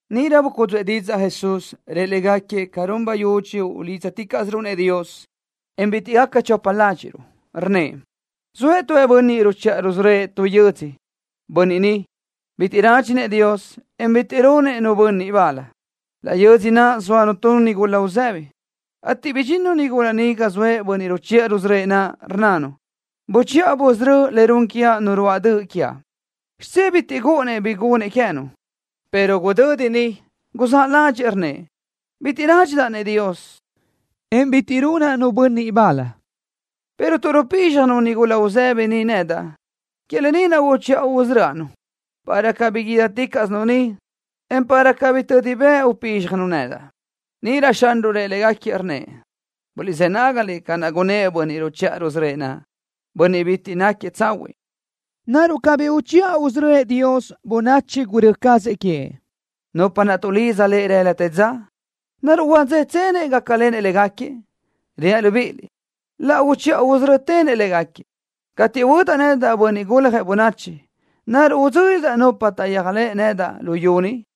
Níʼirö bucúdzuʼë didzaʼ Jesús, rëʼ légaquiëʼ ca run bayudxi ulídzaticaʼsiruʼ-nëʼ Dios, en bitiʼ gaca chopa ládxiʼruʼ. Rnnëʼ: —Zoëʼ tu bönniʼ ruchiʼa rusörö́ëʼ tu yödzö, bönniʼ bitiʼ rádxinëʼ Dios, en bitiʼ runëʼ nu bönniʼ bal. Laʼ yödzö náʼasö zóanu tu nigula uzëbi, ateʼ bidxinnu nigula ni ga zoëʼ bönniʼ ruchiʼa rusörö́ëʼ naʼ, rnnanu: “Buchiʼa busörö́ le run quiaʼ nu ruáʼ döʼ quiaʼ.” Xidzé bitiʼ gúʼunnëʼ bi gunëʼ queë́nu, pero gudödi niʼ guzáʼ ládxëʼë, rnnëʼ: “Bitiʼ rádxidaʼ-nëʼ Dios, en bitiʼ runaʼ nu bönniʼ bal, pero tuʼ rupízxjanu nigula uzëbi ni nedaʼ, que lë ni naʼ uchiʼa usörö́aʼ-nu, para cabí guídaticaʼsinu ni, en para cabí tödi bëʼ upízxjanu nedaʼ.” Níʼirö Xanruʼ rëʼ légaquiëʼ, rnnëʼ: —Guliʼzë́ nágaliʼ ca naʼ gunnë́ʼ bönniʼ ruchiʼa rusörö́ëʼ naʼ, bönniʼ bitiʼ náquiëʼ tsahuiʼ. ¿Naruʼ cabí uchiʼa usörö́ëʼ Dios bönachi gurö́ cazëʼ queëʼ, nupa naʼ tuʼlidza Lëʼ rëla te dza? ¿Naruʼ huadzétsenëʼ gácalenëʼ légaquiëʼ? Reaʼ libíʼiliʼ: Laʼ uchiʼa usörö́tenëʼ légaquiëʼ. Cateʼ huödaʼ nedaʼ, Bönniʼ Guljëʼ Bönachi, ¿naruʼ idzö́lidaʼ nupa taʼyéajlëʼ nedaʼ luyú ni?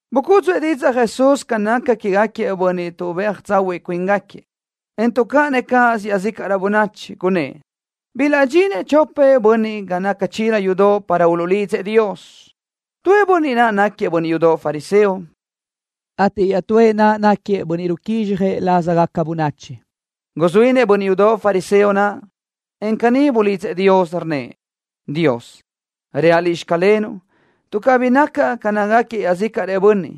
Bucúdzuʼë didzaʼ Jesús ca naca quégaquiëʼ bönniʼ tuʼbéaj tsahuiʼ cuíngaquiëʼ, en tuʼcáʼanëʼ cáʼasö iaʼzícaʼrö bönachi. Gunnë́ʼ: —Bilaʼdxinëʼ chopëʼ bönniʼ ga naca chila yudoʼ para uluʼlidzëʼ Dios. Tuëʼ bönniʼ naʼ náquiëʼ bönniʼ yudoʼ fariseo, ateʼ iaʼtúëʼ naʼ náquiëʼ bönniʼ ruquízxjëʼ lázagaca bönachi. Guzuínëʼ bönniʼ yudoʼ fariseo naʼ, en caní bulidzëʼ Dios, rnnëʼ: “Dios, reaʼ Liʼ: Xclenuʼ, tuʼ cabí nacaʼ ca nácagaquiëʼ iaʼzícaʼrëʼ bönniʼ,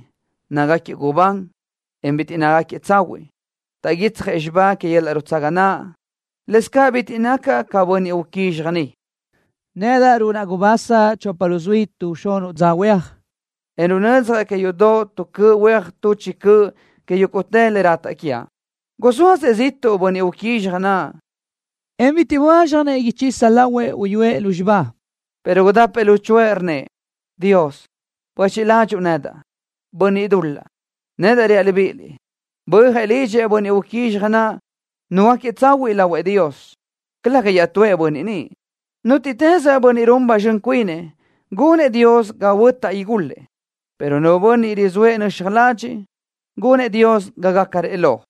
nácagaquiëʼ gubán, en bitiʼ nácagaquiëʼ tsahuiʼ. Taʼguitsjëʼ xibá que yöl-laʼ nutsaga naʼ. Lëscaʼ bitiʼ nacaʼ ca bönniʼ uquízxaj ni. Nedaʼ runaʼ gubasa chopa luzuí tuʼ xunuʼ dza huéaj, en runödzjaʼ que yudoʼ tu cöʼ huéaj tuʼ chi cöʼ que yúguʼtë le rataʼ quiaʼ.” Guzóazëʼ ziʼtuʼ bönniʼ uquízxaj naʼ, en bitiʼ böázxjanëʼ ichisa lahuëʼ uyúëʼ lúzxiba, pero gudapëʼ luchuʼë, rnnëʼ: “Dios, buéchiʼ ladxiʼ nedaʼ, bönniʼ dul-laʼ.” Nedaʼ reaʼ libíʼiliʼ: Bö́ajëʼ lidxëʼ bönniʼ uquízxaj naʼ, nuhuöáquiëʼ tsahuiʼ lahuëʼ Dios, calëga iaʼtúëʼ bönniʼ niʼ. Nútiʼtës bönniʼ run ba zxön cuinëʼ, gunëʼ Dios ga huötaʼ igulëʼ, pero nu bönniʼ rizóëʼ nöxaj ladxiʼ, gunëʼ Dios ga gácarëʼ lo.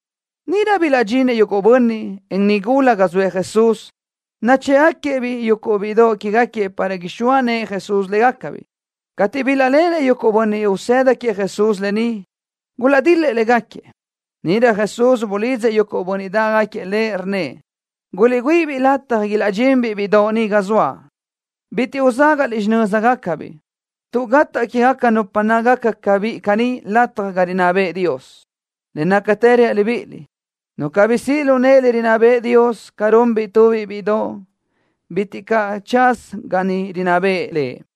Níʼirö bilaʼdxinëʼ yuguʼ bönniʼ, en nigula ga zoëʼ Jesús, nachë́ʼgaquiëʼ-biʼ yuguʼ bíʼidoʼ quégaquiëʼ para ixóa nëʼë Jesús légacabiʼ. Cateʼ bilaʼléʼenëʼ yuguʼ bönniʼ usëda queëʼ Jesús lë ni, gulaʼdil-lëʼ légaquiëʼ. Níʼirö Jesús bulidzëʼ yuguʼ bönniʼ dáʼgaquiëʼ Lëʼ, rnnëʼ: —Guliʼgüíʼi-biʼ lataj ilaʼdxinbiʼ bíʼidoʼ ni ga zoaʼ. Bitiʼ uzágaʼliʼ xinö́zagacabiʼ, tuʼ gataʼ quégaca nupa nácagaca ca biʼi caní lataj ga rinná bëʼë Dios. Le nácatë reaʼ libíʼiliʼ: Nu cabí siʼ lu nëʼe le rinná bëʼë Dios, ca runbiʼ tubiʼ bíʼidoʼ, bitiʼ caʼ tsaza ga niʼ rinná bëʼë Lëʼ.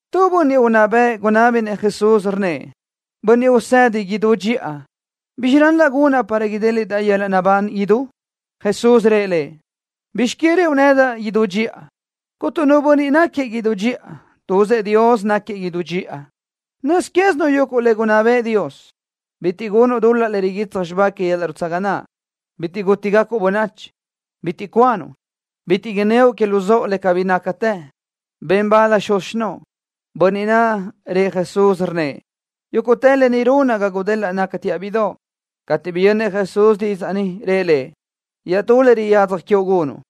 Tu bönniʼ unná bëʼ gunábinëʼ Jesús, rnnëʼ: —Bönniʼ Usedi idú dxiʼa. ¿Bizxi ral-laʼ gunaʼ para idéliʼdaʼ yöl-laʼ naʼbán idú? Jesús rëʼ lëʼ: —¿Bizx que rëʼu nedaʼ: “Idú dxiʼa”? Cuntu nu bönniʼ náquiëʼ idú dxiʼa. Tuzëʼ Dios náquiëʼ idú dxiʼa. Nöz quézinuʼ yuguʼ le gunná bëʼë Dios: Bitiʼ gunuʼ dul-laʼ le riguitsaj xibá que yöl-laʼ nutsaga naʼ. Bitiʼ gútigacuʼ bönachi. Bitiʼ cuanuʼ. Bitiʼ inníoʼ que luzóʼo le cabí nácatë. Ben bal xuz xinóʼo. Bönniʼ naʼ rëʼ Jesús, rnnëʼ: —Yúguʼtë lë ni runaʼ ga gudelaʼ nacaʼ bíʼidoʼ. Cateʼ biyönnëʼ Jesús didzaʼ ni, rëʼ lëʼ: —Iaʼtú le riyadzaj quiuʼ gunuʼ.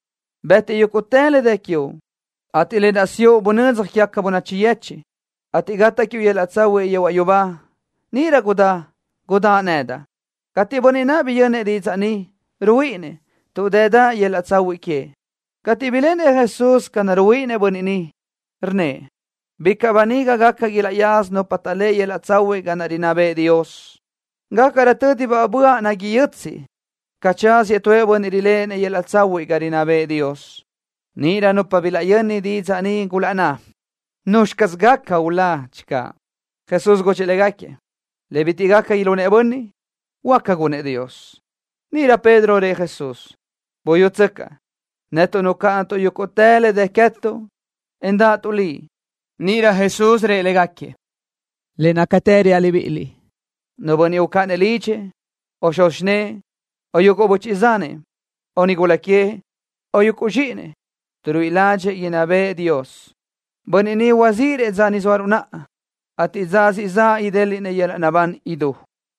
Bëtiʼ yúguʼtë le dë quiuʼ, ateʼ lë naʼ siʼu bunödzaj quégaca bönachi yechiʼ, ateʼ gataʼ quiuʼ yöl-laʼ tsahuiʼ yehuaʼ yubá. Níʼirö gudá, gudáʼ nedaʼ. Cateʼ bönniʼ naʼ biyönnëʼ didzaʼ ni, ruhuíʼinnëʼ, tuʼ dëdaʼ yöl-laʼ tsahuiʼ queëʼ. Cateʼ biléʼenëʼ Jesús ca naʼ ruhuíʼinnëʼ bönniʼ naʼ, rnnëʼ: —¡Bicaʼ böniga gaca, ilaʼyaza nupa taʼléʼe yöl-laʼ tsahuiʼ ga rinná bëʼë Dios! Gácarö tö́dibaʼ böaʼ nagui yötsiʼ, ca tsáziëʼ tu bönniʼ riléʼenëʼ yöl-laʼ tsahuiʼ ga rinná bëʼë Dios. Níʼirö nupa bilaʼyöni didzaʼ ni gulaʼnná: —¿Nuzxi caz gaca ulá, channö? Jesús gudxëʼ légaquiëʼ: —Le bitiʼ gaca ilunëʼ bönniʼ, huáca gunëʼ Dios. Níʼirö Pedro rëʼ Jesús: —Buyútsöcaʼ, netuʼ nucáʼanatuʼ yúguʼtë le dë queë́tuʼ, en dáʼatuʼ Liʼ. Níʼirö Jesús rëʼ légaquiëʼ: —Le nácatë reaʼ libíʼiliʼ, nu bönniʼ ucáʼanëʼ lidxëʼ, o xuz xinë́ʼë, o yuguʼ böchiʼ zanëʼ, o nigula queëʼ, o yuguʼ zxíʼinëʼ, tuʼ ruíʼi ládxëʼë inná bëʼë Dios, bönniʼ ni huazíʼirëʼ dza ni zóaruʼ naʼa, ateʼ dza siʼ zaʼ idéliʼnëʼ yöl-laʼ naʼbán idú.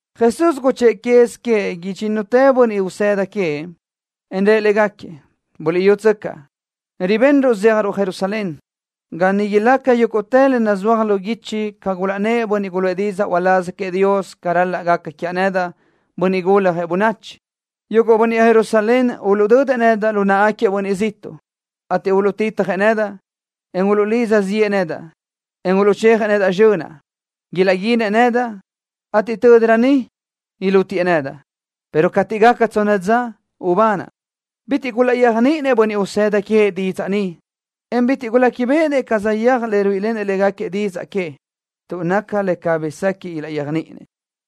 Jesús guchë́ʼë quez queëʼ idxínnutëʼ bönniʼ usëda queëʼ, en rëʼ légaquiëʼ: —Buliʼyútsöcaʼ, ribenruʼ zéajruʼ Jerusalén, ga niʼ ilaca yúguʼtë le nazúajgaca lu guichi ca gulaʼnnë́ʼ bönniʼ guluʼë didzaʼ uláz queëʼ Dios ca ral-laʼ gaca quiaʼ nedaʼ, Bönniʼ Guljëʼ Bönachi. Yuguʼ bönniʼ Jerusalén uluʼdödëʼ nedaʼ lu náʼagaquiëʼ bönniʼ ziʼtuʼ, ateʼ uluʼtitjëʼ nedaʼ, en uluʼlidza ziʼë nedaʼ, en uluʼchejëʼ nedaʼ zxönaʼ. Ilaʼguinëʼ nedaʼ, ateʼ tö́dirö niʼ ilútiëʼ nedaʼ, pero cateʼ gaca tsonna dza ubanaʼ. Bitiʼ gulaʼyéajniʼinëʼ bönniʼ usëda queëʼ didzaʼ ni, en bitiʼ guléquibeʼenëʼ ca saʼyéaj le ruíʼilenëʼ légaquiëʼ didzaʼ que, tuʼ naca le cabí sequiʼ ilaʼyéajniʼinëʼ.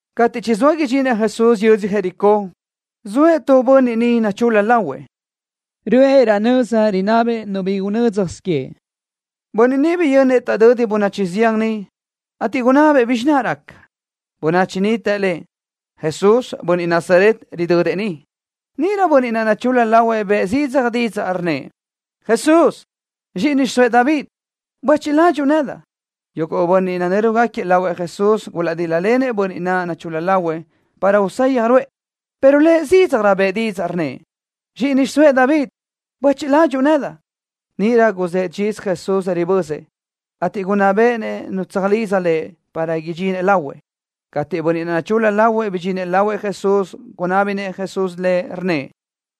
Cateʼ chizóa idxinëʼ Jesús yödzö Jericó, zoëʼ tu bönniʼ niʼ nachul-la lahuëʼ. Röʼë raʼ nöza rinabëʼ nu bi gúnnasö queëʼ. Bönniʼ niʼ biyönnëʼ taʼdödi bönachi zián niʼ, ateʼ gunabëʼ bizxi naʼ raca. Bönachi niʼ të lëʼ: —Jesús, bönniʼ Nazaret, ridödëʼ ni. Níʼirö bönniʼ naʼ nachul-la lahuëʼ bëʼë zidzaj didzaʼ, rnnëʼ: —¡Jesús, zxíʼini xiʼsóëʼ David, buéchiʼ ladxiʼ nedaʼ! Yuguʼ bönniʼ nanö́rugaquiëʼ lahuëʼ Jesús gulaʼdil-lëʼ bönniʼ naʼ nachul-la lahuëʼ para usayaj ruʼë, pero lëʼ zídzajrö bëʼë didzaʼ, rnnëʼ: —¡Zxíʼini xiʼsóëʼ David, buéchiʼ ladxiʼ nedaʼ! Níʼirö guzë́ʼ dxiz Jesús ribözëʼ, ateʼ gunná béʼenëʼ nu tsöjlidza lëʼ para idxinëʼ lahuëʼ. Cateʼ bönniʼ naʼ nachul-la lahuëʼ bidxinëʼ lahuëʼ Jesús, gunábinëʼ Jesús lëʼ, rnnëʼ: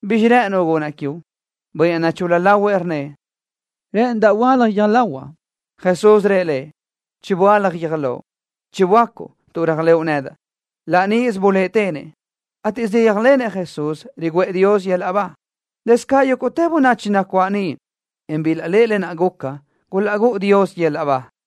—¿Bizxi rë́ʼënuʼ gunaʼ quiuʼ? Bönniʼ naʼ nachul-la lahuëʼ rnnëʼ: —Rë́ʼënidaʼ huöálaj guiö́j lahuaʼ. Jesús rëʼ lëʼ: —Chiböálaj guiö́j loʼ. Chiböácuʼ tuʼ réajlëʼu nedaʼ. Laʼ níʼisö buléʼetenëʼ, ateʼ saʼyéajlenëʼ Jesús, riguʼë Dios yöl-laʼ ba. Lëscaʼ yúguʼtë bönachi nacuáʼ niʼ, en bilaʼléʼe lë naʼ guca gulaʼgúʼu Dios yöl-laʼ ba.